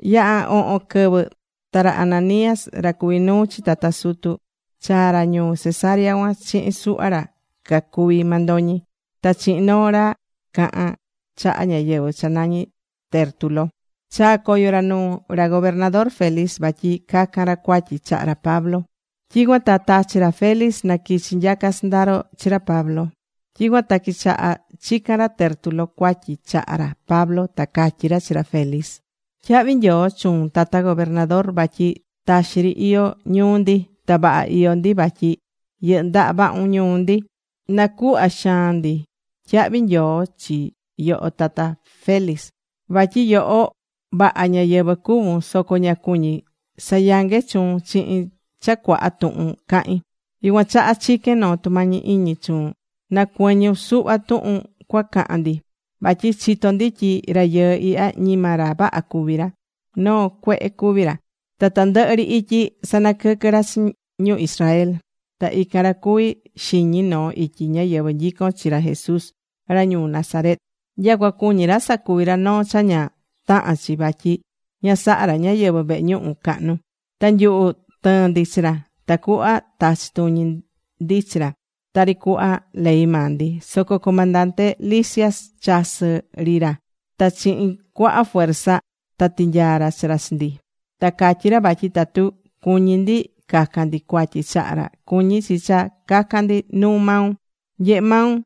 Yaha̱ ohon quɨvɨ ta ra Ananías, ra cuví nuu chi tata sutu, chaa̱ ra ñuu Cesarea cuan chihin suhva ra cacuví mandoñi, ta chihin noo ra cahan chaha ñáyɨvɨ cha nañí Tértulo. Chaá coyo ra nuu ra gobernador Félix vatyi cacan ra cuatyi chaha ra Pablo. Tyicuan ta tachi̱ ra Félix na quichi nyaca sɨndaro chi ra Pablo. Tyicuan ta quichaha̱ chican ra Tértulo cuatyi chaha ra Pablo. Ta catyí ra chi ra Félix: ―Tyahvi nyoo chuun, tata gobernador. Vatyi taxi ri iyó ñuu ndi, ta vaha iyó ndi vatyi yɨndaha vahun ñuu ndi. Nacuhvá xaan ndi tyahvi nyoo chi yoho tata Félix, vatyi yoho, vaha ñáyɨvɨ cuvún. Soco ña cuñí sayangue chuun chihin cha cuaha tuhun cahin, yucuan chaha chiquén noo tumañi iñi chuun na cuɨñun suhva tuhun cuacahan ndi. Vatyi chitó ndi tyi rayɨɨ ihya ñima ra vaha cuví ra, noo cuehe cuví ra. Ta tandɨhɨ ri ityi sanaquɨquɨ́ ra chi ñu Israel. Ta ican ra cuví xiñi noo ityi ñáyɨvɨ nyicón chi ra Jesús ra ñuu Nazaret. Nyacua cuñí ra sacuvi ra noo cha ña tahán chi vatyi ña sahá ra ñáyɨvɨ vehe ñuhu cahnu. Ta nyuhu tɨɨ̱n ndi chi ra, tacuhva tachi tuñi ndi chi ra tari cuhva ley maa ndi. Soco comandante Licias chasɨ̱ ri ra ta chihin cuaha fuerza ta tinyaa̱ ra chi ra chi ndi. Ta catyí ra vatyi tatu cuñí ndi cacan ndi cuatyi chaha ra, cuñí chi cha cacan ndi nuu maun. Nye̱he maun.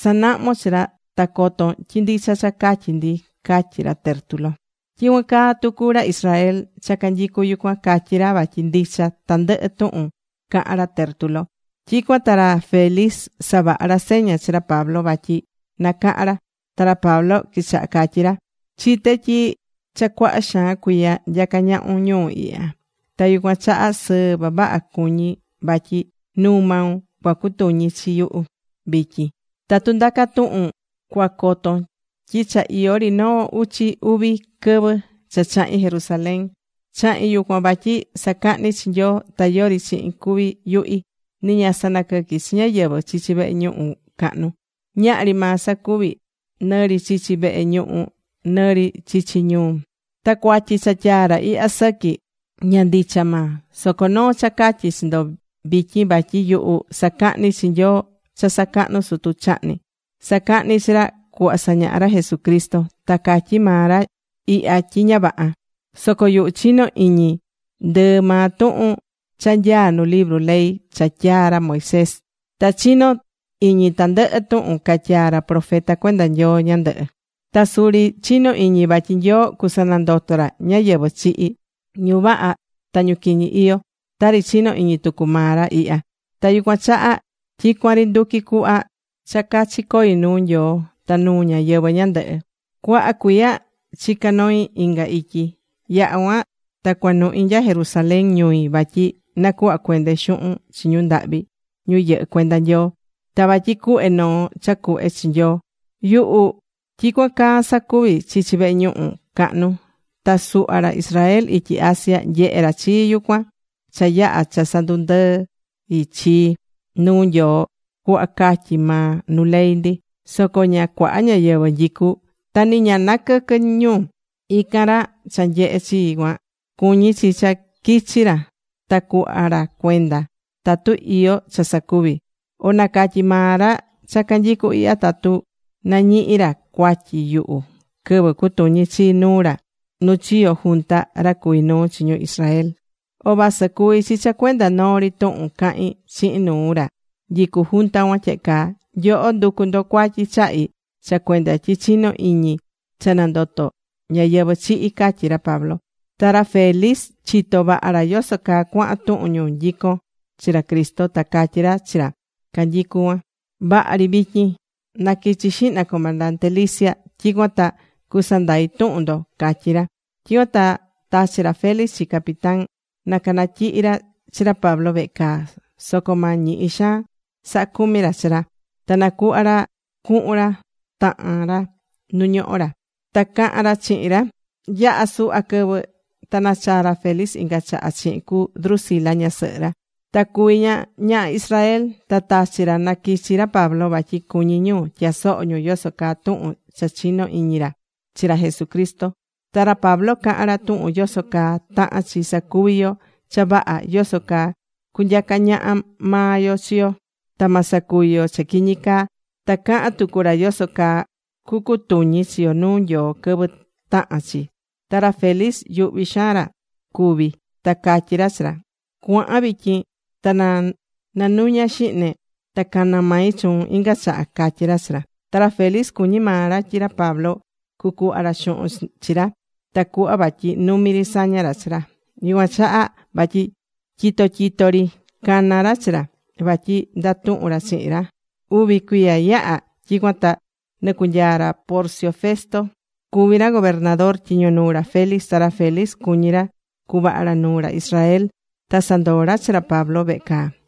Sa̱nahmon chi ra ta coton tyi ndicha cha catyí ndi ―catyí ra Tértulo. Tyicuan caa tucu ra Israel cha canyicu yucuan, catyí ra vatyi ndicha tandɨhɨ tuhun cahan ra Tértulo. Tyicuan ta ra Félix savaha̱ ra seña chi ra Pablo vatyi nacahan ra. Ta ra Pablo quichaha catyí ra: ―Chité tyi cha cuaha xaan cuiya nyacá ñahun ñuu ihya. Ta yucuan chaha sɨɨ vavaha cuñí vatyi nuu maun cuacutuñi chi yuhu vityin. Tatu ndaca tuhun cuacoton tyi cha iyó ri noo uchi uvi quɨvɨ cha chahi̱n Jerusalén. Chahi̱n yucuan vatyi sacahni chi Nyoo. Ta yori chihin cuvi̱ yuhi. Ni ña sanaquɨqui̱ chi ñáyɨvɨ chichi vehe ñuhu cahnu. Ñahri maa sacuvi̱, nɨ ri chichi vehe ñuhu, nɨ ri chichi ñuu. Ta cuatyi cha tyaá ra ihya sɨqui, ña ndicha maa. Soco noo cha catyí chi ndo vityin vatyi yuhu sacahní chi Nyoo cha sacahnu̱ sutu chahni. Sacahní chi ra cuhva sañahá ra Jesucristo. Ta catyí maa ra ihya tyi ña vaha. Soco yuhu chinó iñi ndɨɨ maa tuhun cha nyaá nu libru ley cha tyaa̱ ra Moisés. Ta chinó iñi tandɨhɨ tuhun catyaa̱ ra profeta cuenda Nyoo ñandɨhɨ. Ta suri chinó iñi vatyi Nyoo cusanandoto ra ñáyɨvɨ chihi̱, ñu vaha ta ñu quiñi iyó, tari chinó iñi tucu maa ra ihya. Ta yucuan chaha tyicuan ri nduquí cuhva cha cachi coí nuu Nyoo, ta nuu ñáyɨvɨ ñandɨhɨ. ’Cuaha cuiya chica noi̱ inga ityi. Yaha̱ cuan ta cuanuhi̱ nya Jerusalén ñui vatyi nacuhva cuende xuhun chi ñu ndahvi ñu yɨhɨ́ cuenda Nyoo, ta vatyi cuhve noo cha cuhve chi Nyoo. Yuhu tyicuan caa sacuví chichi vehe ñuhu cahnu, ta suhva ra Israel ityi Asia, nyehe ra chii yucuan cha yaha̱ cha sandundɨi̱ chii nuu Nyoo cuhva catyí maa nu ley ndi. Soco ña cuaha ñáyɨvɨ nyicu, ta ni ña naquɨquɨ̱ ñu. Ican ra cha nyehe̱ chii cuan, cuñí chi cha quichi ra ta cuhva ra cuenda tatu iyó cha sacuvi̱. O na̱catyi maa ra cha canyicu ihya tatu nañihi̱ ra cuatyi yuhu quɨvɨ cutuñi̱ chii nuu ra nu chiyo̱ junta ra cacuví nuu chi ñu Israel. O vasɨ cuví chi cha cuenda noo ri tuhun cahi̱n chihin nuu ra nyicú junta cuan tyehe caa: “Nyoho nducú ndo cuatyi chahi cha cuenda tyi chinó iñi cha nandotó ñáyɨvɨ chihi̱” ―catyí ra Pablo. Ta ra Félix chitó vaha ra yoso caa cuahan tuhun ñu nyicón chi ra Cristo. Ta catyí ra chi ra canyicu cuan: ―Vaha ri vityin. Na quichi xihna comandante Lisias. Tyicuan ta cusandai tuhun ndo ―catyí ra. Tyicuan ta tachi̱ ra Félix chi capitán na cunatyihi ra chi ra Pablo vehe caa. Soco ma ñihi xaan saha cumi ra chi ra. Ta na cuhva ra cuhun ra tahan ra nu ñohó ra, ta cahan ra chihin ra. Yaha̱ suhva quɨvɨ ta nachaa̱ ra Félix inga chaha chihin cu Drusila ñasɨhɨ ra. Ta cuví ña ñaha Israel. Ta tachi̱ ra na quichi ra Pablo vatyi cuñí ñu tyasoho ñu yoso caa tuhun cha chinó iñi ra chi ra Jesucristo. Ta ra Pablo caha̱n ra tuhun yoso caa tahán chi sacuvi yo cha vaha, yoso caa cunyaca ñaha maa yo chi yo ta ma sacuvi yo cha quiñi caa. Ta caha̱n tucu ra yoso caa cucutuñi chi yo nuu Nyoo quɨvɨ tahan chi. Ta ra Félix yuhvi̱ xaan ra cuvi, ta catyí ra chi ra: ―Cua̱han vityin. Ta na nanuña xihne, ta cana mai chuun inga chaha ―catyí ra chi ra. Ta ra Félix cuñí maa ra tyi ra Pablo cucuhva ra xuhun chi ra, tacuhva vatyi numi ri saña ra chi ra. Yucuan chaha vatyi tyito tyito ri cana̱ ra chi ra, vatyi ndatuhun ra chihin ra. Uvi cuiya yaha̱, tyicuan ta nɨcunyaa ra Porcio Festo cuví ra gobernador tyiño nuu ra Felix. Ta ra Felix cuñí ra cuvaha ra nuu ra Israel ta sandoo ra chi ra Pablo vehe caa.